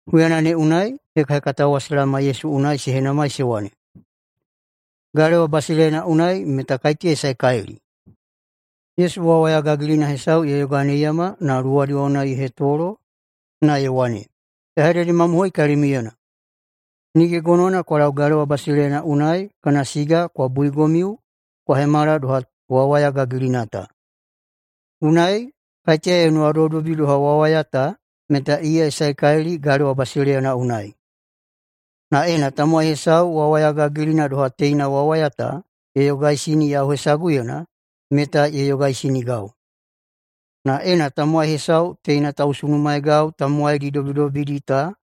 Huyana ne unai hekahekatao wa se laoma Yesu unai se henamai se wane, “Galewa basileiyana unai meta kaiteya ye saekalili?” Yesu wawaya gagilina hesau ye yoganeiyama na luwadi wa unai ye hetolo, na ye wane, “Ya hededemamohoi kalimiuyena: Nige gonowana kwa lau galewa basileiyana unai kana siga kwa buigomiu kwa hemala doha wawaya gagilina ta. Unai, kaiteya ye nuwadobidobi doha wawaya ta meta iya ye saekalili galewa basileiyana unai. Na ena tamowai hesau wawaya gagilina doha teina wawaya ta ye yogaisini yau hesaguyena meta ye yogaisinigau. Na ena tamowai hesau teina tausunumaegau tamowaidi dobidobidi ta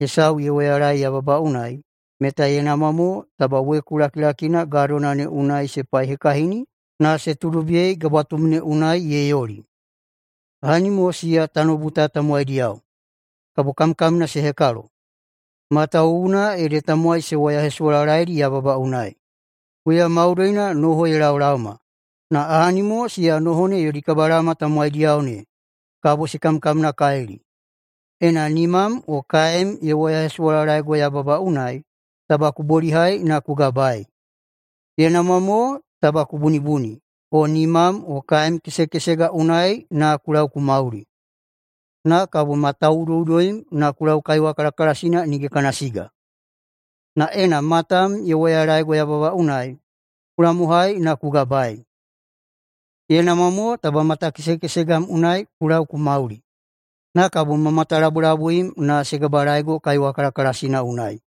hesau ye woyalaei yababa unai, meta ye namwa mo taba weku lakilakina gadona ne unai se paihekahini na se tuudobiyei gabwatum ne unai ye yoli. Ahani mo siya tanoubu ta tamowaidiyao, kabo kamkamna se hekalo, matawuwuna ede tamowai se woyahesuwalalaeidi yababa unai. Huya maudoina noho se laolaoma, na ahani mo siya noho ne yodi kabalaoma tamowaidiyao ne, kabo se kamkamnakalili. Ena nimam o kaem ye woyahesuwalalaego yababa unai, taba ku bolihai na ku gabaei. Ye namwa mo taba ku bunibuni o nimam o kaem kesekesega unai na ku lau ku mauli, na kabo ma tauꞌudoꞌudoim na ku lau kaiwa kalakalasina nige kana siga. Na ena matam ye woyalaego yababa unai, ku lamohai na ku gabaei. Ye namwa mo taba matakesekesegam unai ku lau ku mauli, na kabo ma matalabulabuim na se gabalaego kaiwa kalakalasina unai.”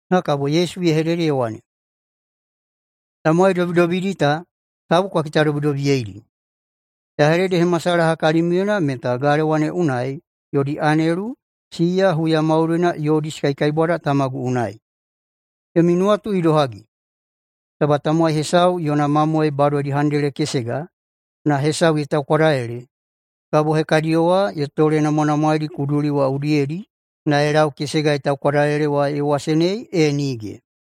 Na kabo Yesu ye hedede ye wane, “Tamowai dobidobidi ta, tabu kwa kitadobidobiyeidi. Ya hededehemasalaha kalimiuyena meta galewa ne unai yodi anelu, siya huya maudoina yodi se kaikaibwada Tamagu unai. Yomi nuwatu idohagi? Taba tamowai hesau yona mamoe badodi handele kesega, na hesau ye taukwadalele, kabo hekadiyo wa ye tolenamwanamwaedi kuduli wa udiyedi na ye lau kesega ye taukwadalele wa ye wasenei, e nige?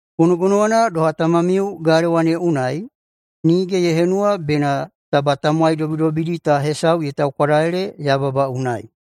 Gonogonowana doha, Tamamiu galewa ne unai nige ye henuwa bena taba tamowai dobidobidi ta hesau ye taukwadalele yababa unai.”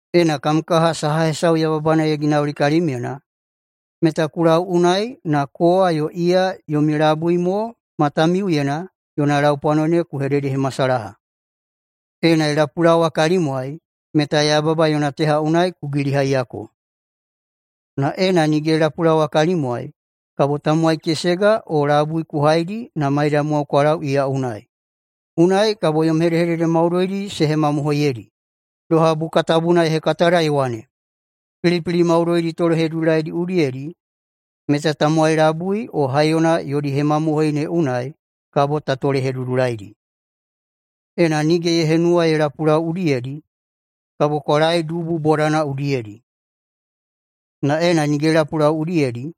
“Ena kam kaha saha hesau yababana ye ginauli kalimyena, meta ku lau unai na kowa yo iya yomi labui mo matamiuyena yona laupwano ne ku hededehemasalaha. Ena ye lapulaowa kalimwai, meta yababa yona teha unai ku gilihaiyako. Na ena nige ye lapulaowa kalimwai, kabo tamowai kesega o labui ku haidi na maidamwao kwa lau iya unai. Unai kabo yom hedehedede maudoidi se hemamohoiyedi, doha Buka Tabuna ye hekatada ye wane, ‘Pilipili maudoidi tolehedudulaidi udiyedi meta tamowai labui o haiyona yodi hemamohoi ne unai kabo ta tolehedudulaidi.’ Ena nige ye henuwa ye lapulau udiyedi, kabo kwa laei dubu bodana udiyedi. Na ena nige ye lapulau udiyedi,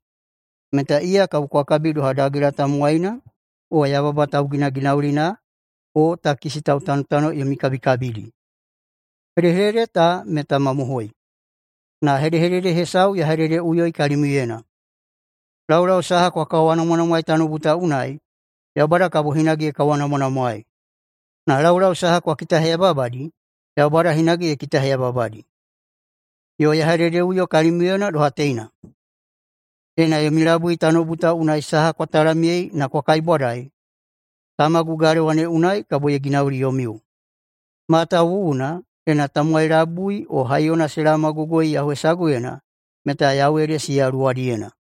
meta iya kabo kwa kabi doha dagela tamowaina o yababa tauginaginaulina o takisi tautanotano yomi kabikabidi. Hedehedede ta meta mamohoi, na hedehedede hesau ya hededeꞌuyoi kalimiuyena: Laulau saha kwa kawanamwanamwaei tanoubu ta unai, Yaubada kabo hinage ye kawanamwanamwaei, na laulau saha kwa kitaheyababadi, Yaubada hinage ye kitaheyababadi. Yo ya hededeꞌuyo kalimiuyena doha teina: Ena yomi labui tanoubu ta unai saha kwa talamyei na kwa kaibwadai, Tamagu galewa ne unai kabo ye ginauli yomiu. Matawuwuna, ena tamowai labui o haiyona se laomagogoi yau hesaguyena, meta yau ede siya luwadiyena.”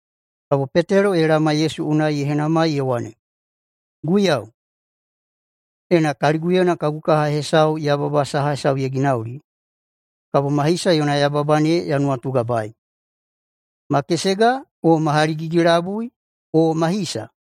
Kabo Petelo ye laoma Yesu unai ye henamai ye wane, “Guiyau, ena kaliguyena kagu kaha hesau yababa saha hesau ye ginauli, kabo ma hisa yona yababa ne ya nuwatugabaei? Ma kesega o ma haligigi-labui o ma hisa?”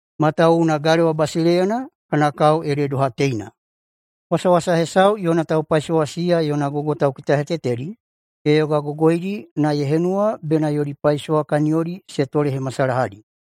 Matawuwuna galewa basileiyana kana kao ede doha teina: Wasawasa hesau yona taupaisowa siya yona gogo taukitahetetedi ye yogagogoidi na ye henuwa bena yodi paisowa kaniyodi se tolehemasalahadi.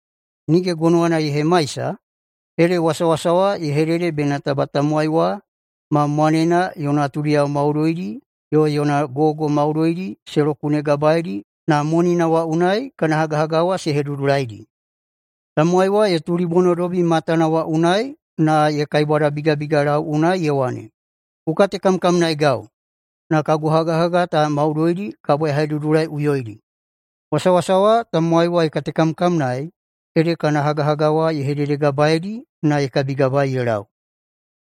Nige gonowana ye hemaisa, ede wasawasa wa ye hedede bena taba tamowai wa ma mwanena yo natudiyao maudoidi, yo yona gogo maudoidi se lokunegabaeidi na monina wa unai kana hagahaga wa se hedudulaidi. Tamowai wa ye tulibonodobi matana wa unai na ye kaibwadabigabigalau unai ye wane, ‘Ku katekamkamnaegau, na kagu hagahaga ta maudoidi kabo ya hedudulaiꞌuyoidi.’ Wasawasa wa tamowai wa ye katekamkamnaei ede kana hagahaga wa ye hededegabaeidi na ye kabigabaei ye lau.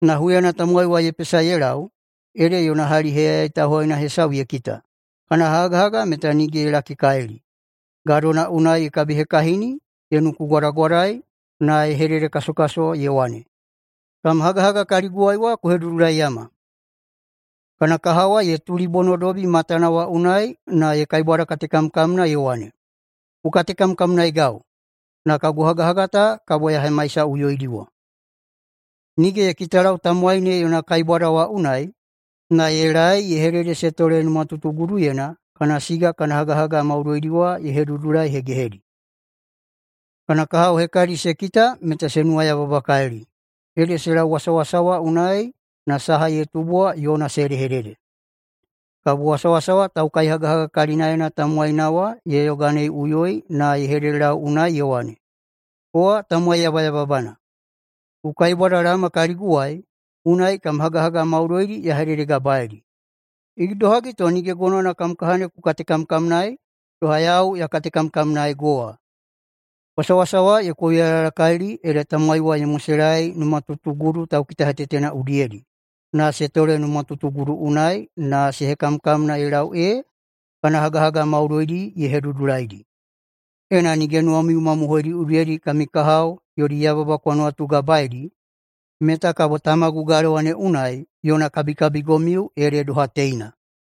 Na huyana tamowai wa ye pesa ye lau ede yona hali heyayai tauhaina hesau ye kita kana hagahaga meta nige ye lakikalili. Gadona unai ye kabihekahini ye nukugwadagwadai na ye hededekasokaso ye wane, ‘Kam hagahaga kaliguwai wa ku hedudulaiyama!’ Kana kaha wa ye tulibonodobi matana wa unai na ye kaibwadakatekamkamna ye wane, ‘Ku katekamkamnaegau, na kagu hagahaga ta kabo ya hemaisaꞌuyoidiwa.’ Nige ye kitalau tamowai ne yona kaibwada wa unai, na ye laei ye hedede se tole numatutuguduyena kana siga kana hagahaga maudoidi wa ye hedudulaihegehedi. Kana kahao hekadi se kita meta se nuwayababakalili, ede se lau wasawasa wa unai na saha ye tubu wa yona se hedehedede. Kabo wasawasa wa taukaihagahaga kalinaena tamowaina wa ye yoganeiꞌuyoi na ye hededelau unai ye wane, ‘Kowa tamowai yabayababana! Ku kaibwadalaoma kaliguwai, unai kam hagahaga maudoina ya hededegabaei. Idohagi to nige gonowana kam kaha ne ku katekamkamnaei doha yau ya katekamkamnaego wa?’ Wasawasa wa ye kouyalayalakalili ede tamowai wa ye moselaei numatutugudu taukitahetetena udiyedi na se tole numatutugudu unai na se hekamkamna ye lau ee kana hagahaga maudoidi ye hedudulaidi. Ena nige nuwamiu mamohoidi udiyedi kami kahao yodi yababa kwa nuwatugabaeidi, meta kabo Tamagu galewa ne unai yona kabikabigomiu ede doha teina.”